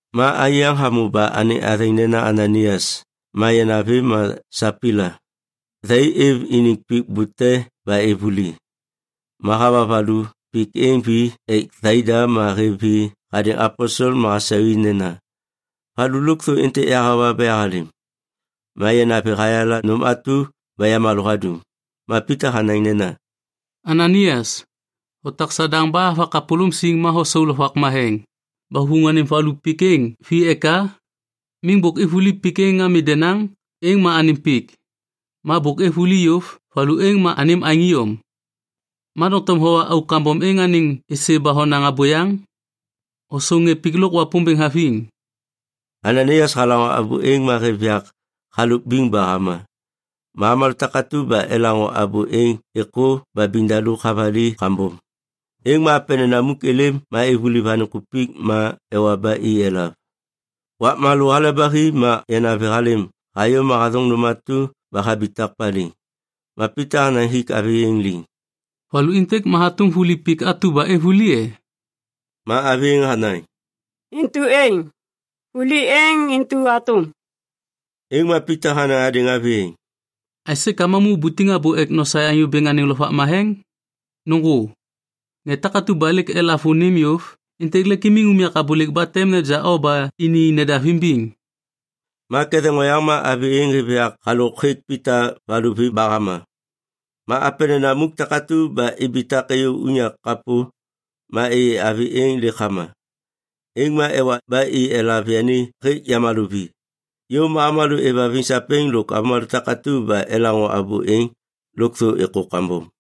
Ma anyô yaŋ hamô ba anêŋ athêŋ nena Ananaias ma yanavi ma Sapaila. Thai êv iniŋ pik bute ba êv vuli. Ma hawa valu pik êŋ vi ek thaida ma hêv vi hadêŋ aposel ma hasau i nena, “Valu lôkthô êntêk yahawa ba yahalêm.” Ma yanavi hayala nôm atu ba yamalô hadum. Ma Pita hanaŋ nena, “Ananaias, hotak Sadaŋ ba hava kapôlôm siŋ ma hosau Lovak Matheŋ, ba huvuŋ anêm valu pik êŋ vi eka? Miŋ bôk êv vuli pik êŋ ami denaŋ, êŋ ma anêm pik. Ma bôk êv vuli yôv, valu êŋ ma anêm aêŋ iyom. Ma doŋtom howa auk kambom êŋ anêŋ êsê ba honaŋ abôyaŋ? Hosau ŋê pik lôk Wapômbêŋ haviŋ.” Ananaias halaŋô abô êŋ ma hêv yak halôk biŋ ba hama. Ma avômalô takatu ba elaŋô abô êŋ êkô ba biŋdaluk havali kambom. Êŋ ma apenena muk êlêm ma ivuliv anêŋ kupik ma ewa ba i elav. Wakma lô hale ba hi ma yanavi halêm hayô ma hathôŋ nôm atu ba habitak paliŋ. Ma Pita hanaŋ hik avi êŋ liŋ, “Valu êntêk ma hatôm vuli pik atu ba êv vuli e?” Ma avi êŋ hanaŋ, “Intu êŋ, vuli êŋ intu hatôm.” Êŋ ma Pita hanaŋ hadêŋ avi êŋ, “Aisê ka mamu ubutiŋ abô ek nosaê Anyô Bêŋ anêŋ Lovak Matheŋ? Nôŋgô! Ŋê takatu ba lêk elav vônim yôv, êntêk lêk imiŋ unyak abôlêk ba tem neja o ba ini nedav imbiŋ.” Ma ketheŋ oyaŋ ma avi êŋ hêv yak halôk hêk Pita valuvi ba hama. Ma apenena muk takatu ba ibitak êyô unyak kapô. Ma êyê avi êŋ lêk hama. Êŋ ma ewa ba i elav yani hêk yamalô vi. Yôv ma avômalô êvhaviŋ sapêŋ lôk avômalô takatu ba elaŋô abô êŋ, lôkthô êkô kambom.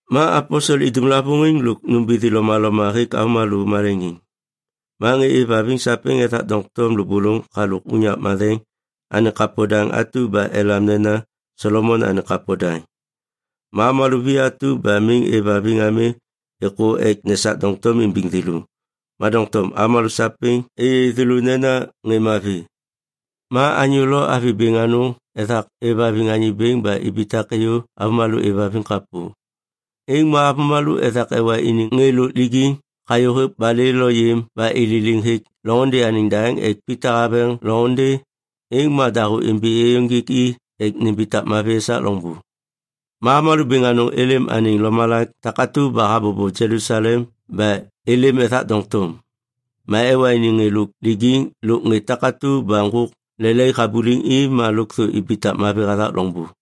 Ma aposel idum lavôŋiŋ lôk nômbithi lomaloma hêk avômalô maleŋiŋ. Ma ŋê êvhaviŋ sapêŋ ethak doŋtom lôbôlôŋ halôk unyak matheŋ anêŋ kapo daŋ atu ba elam nena Solomon anêŋ Kapo Daŋ. Ma avômalô vi atu ba miŋ êvhaviŋ ami êkô ek nesak doŋtom imbiŋ thêlô, ma doŋtom avômalô sapêŋ êyê thêlô nena ŋê mavi. Ma anyô lo avi bêŋ anôŋ ethak êvhaviŋ Anyô Bêŋ ba ibitak êyô avômalô êvhaviŋ kapô. Êŋ ma avômalô ethak ewa iniŋ ŋê lôk lijiŋ hayô hêk balê lo yêm ba i ililiŋ hêk loŋôndê anêŋ daŋ ek Pita haveŋ loŋôndê, êŋ ma dahô imbi êyôŋgêk i ek nimbitak mavi esak loŋbô. Ma avômalô bêŋ anôŋ êlêm anêŋ lomalak takatu ba habobo Jelusalem ba êlêm ethak doŋtom. Ma ewa iniŋ ŋê lôk lijiŋ lôk ŋê takatu ba ŋgôk lelaik habuliŋ i ma lôkthô ibitak mavi hathak loŋbô.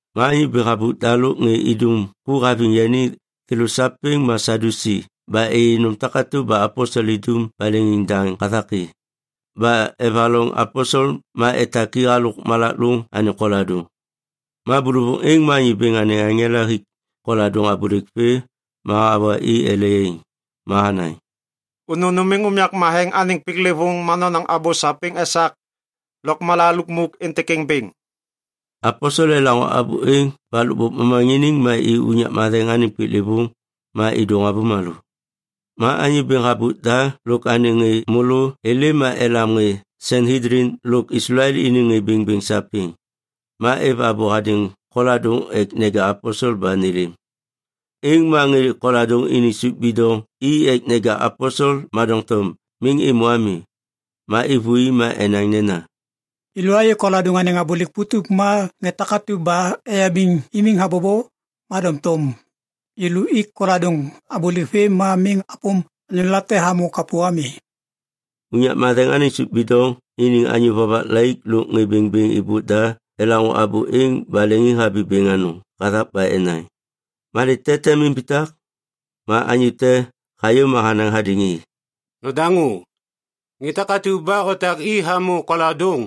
Ma anyô bêŋ habôk da lôk ŋê idum ku haviŋ yani, thêlô sapêŋ ma Sadyusi ba êyê nôm takatu ba aposel idum ba leŋiŋdaŋ hathak i. Ba evaloŋ aposel ma etak i halôk malak lôŋ anêŋ koladôŋ. Ma bôlôvôŋ êŋ ma Anyô Bêŋ anêŋ aŋela hik koladôŋ abôlêk vê ma hawa i ele yaiŋ. Ma hanaŋ, “Unu numiŋ unyak matheŋ anêŋ piklêvôŋ ma nonaŋ abô sapêŋ esak lôkmala lukmuk êntêk êŋ bêŋ.” Aposel elaŋô abô êŋ ba lôkbôk momaŋiniŋ ma i unyak matheŋ anêŋ piklêvôŋ. Ma êdôŋ avômalô. Ma anyô bêŋ habôk da lôk anêŋ ŋê môlô êlêm ma elam ŋê Sanhedlin lôk Islael iniŋ ŋê bêŋbêŋ sapêŋ. Ma êv abô hadêŋ koladôŋ ek neja aposel ba nêlêm. Êŋ ma ŋê koladôŋ iniŋ sôp bidoŋ i ek neja aposel ma doŋtom miŋ êmô ami. Ma êvôi ma enaŋ nena, “Yêlô ayê koladôŋ anêŋ abôlêk putup ma ŋê takatu ba eyabiŋ imiŋ habobo. Ma doŋtom yêlô ik koladôŋ abôlêk vê ma miŋ apôm anyô late hamô kapô ami.” Unyak matheŋ anêŋ sôp bidoŋ iniŋ anyô vovak laik lôk ŋê bêŋbêŋ êbôk da elaŋô abô êŋ ba leŋiŋhabi bêŋ anôŋ hathak ba enaŋ, “Malê te tem imbitak?” Ma anyô te hayô ma hanaŋ hadêŋ i, “Nodaŋô! Ŋê takatu ba otak i hamô koladôŋ,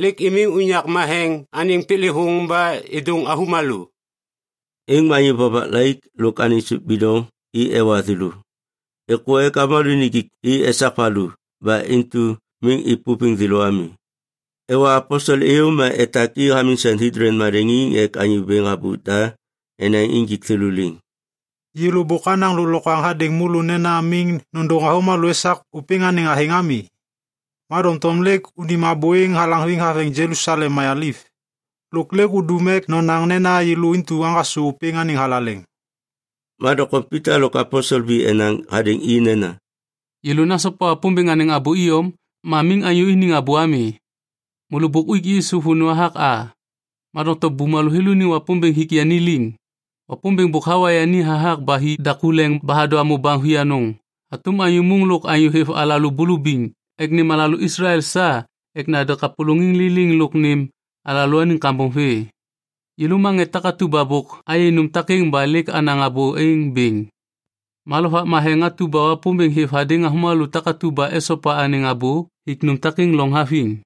lêk imiŋ unyak matheŋ anêŋ piklêvôŋ ba êdôŋ avômalô.” Êŋ ma anyô vovak laik lôk anêŋ sôp bidoŋ i ewa thêlô. Êkô ek avômalô nijik i esak valu ba intu miŋ êpôviŋ thêlô ami. Ewa aposel êyô ma etak i hamiŋ Sanhedlin maleŋiŋ ek anyô bêŋ habôk da enaŋ injik thêlô liŋ. “Yêlô bôk anaŋ lôklokwaŋ hadêŋ môlô nena miŋ nôndôŋ avômalô esak ôpêŋ anêŋ athêŋ ami. Ma doŋtom lêk unim abô êŋ halaŋviŋ haveŋ Jelusalem mayaliv. Lôk lêk udum ek nonaŋ nena yêlô intu aŋgasô ôpêŋ anêŋ thalaleŋ.” Ma doŋtom Pita lôk aposel vi enaŋ hadêŋ i nena, “Yêlô nasopa Wapômbêŋ anêŋ abô iyom ma miŋ anyô iniŋ abô ami. Môlô bôk uik Yisu vônô hathak a. Ma doŋtom bumalô thêlô iniŋ Wapômbêŋ hik yani liŋ. Wapômbêŋ bôk hawa yani hathak ba hi daku leŋ ba hadô hamô baŋ vianôŋ hatôm Anyô Môŋ lôk Anyô hêv alalô bulubiŋ ek nêm alalô Islael sa ek nande kapôlôŋiŋ liliŋ lôk nêm alalôaniŋ kambom vê. Yêlô ma ŋê takatu ba bôk ayê nôm takêŋ ba lêk anaŋ abô êŋ bêŋ. Ma Lovak Matheŋ atu ba Wapômbêŋ hêv hadêŋ avômalô takatu ba esopa anêŋ abô hik nôm takêŋ loŋ haviŋ.”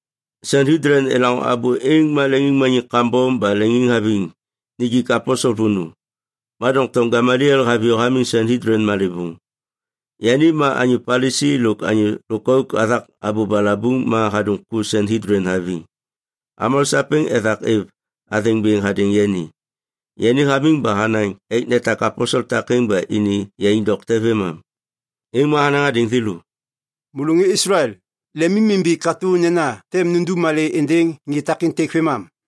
Sanhedlin elaŋô abô êŋ ma leŋiŋmaniŋ kambom ba leŋiŋhaviŋ nijik aposel vônô. Ma doŋtom Gameliel haviyô hamiŋ Sanhedlin malêvôŋ. Yani ma anyô Palisi lôk anyô lôkauk hathak abô balabuŋ ma hadum ku Sanhedlin haviŋ. Avômalô sapêŋ ethak êv athêŋ bêŋ hadêŋ yani. Yani hamiŋ ba hanaŋ ek netak aposel takêŋ ba ini yaiŋ dokte vêmam. Êŋ ma hanaŋ hadêŋ thêlô, “Môlô ŋê Islael, lemimimbi katô nena tem nundum malê êndêŋ ŋê takêntêk vêmam.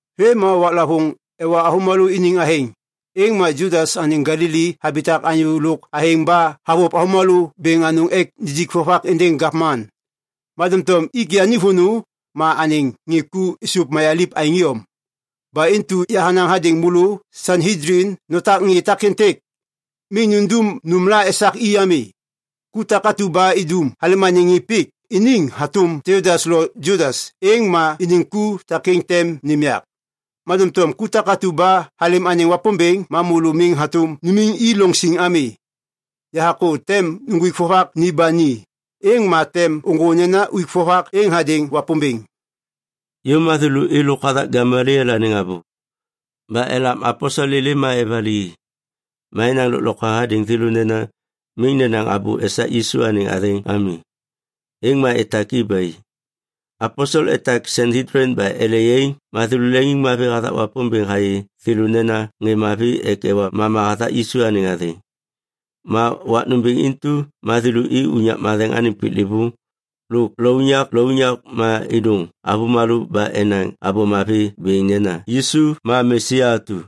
Vêm ma waklavôŋ ewa avômalô iniŋ athêŋ, êŋ ma Judas anêŋ Galili habitak anyô lôk athêŋ ba havôv avômalô bêŋ anôŋ ek nijik vovak êndêŋ gavman. Ma doŋtom ik yani vônô, ma anêŋ ŋê ku êsôv mayaliv aêŋ iyom. Ba intu yahanaŋ hadêŋ môlô Sanhedlin: Notak ŋê takêntêk. Miŋ nundum nômla esak i ami. Ku takatu ba idum halêm anêŋ ŋê pik iniŋ hatôm Teudas lo Judas, êŋ ma iniŋ ku takêŋ tem nêm yak. Ma doŋtom ku takatu ba halêm anêŋ Wapômbêŋ, ma môlô miŋ hatôm numiŋ i loŋ siŋ ami. Yahakô tem uŋgwik vovak ni ba ni, êŋ ma tem ôŋgô nena uik vovak êŋ hadêŋ Wapômbêŋ.” Yôv ma thêlô êlôk hathak Gameliel anêŋ abô. Ba elam aposel êlêm ma evali i. Ma enaŋ lôklokwaŋ hadêŋ thêlô nena miŋ nenaŋ abô esak Yisu anêŋ athêŋ ami. Êŋ ma etak i ba i. Aposel etak Sanhedlin ba ele yaiŋ ma thêlô leŋiŋmavi hathak Wapômbêŋ hayê thêlô nena ŋê mavi ek ewa mama hathak Yisu anêŋ athêŋ. Ma wak nômbêŋ intu ma thêlô i unyak matheŋ anêŋ piklêvôŋ lôk lounyak lounyak ma êdôŋ avômalô ba enaŋ Abô Mavi bêŋ nena Yisu ma Mesia atu.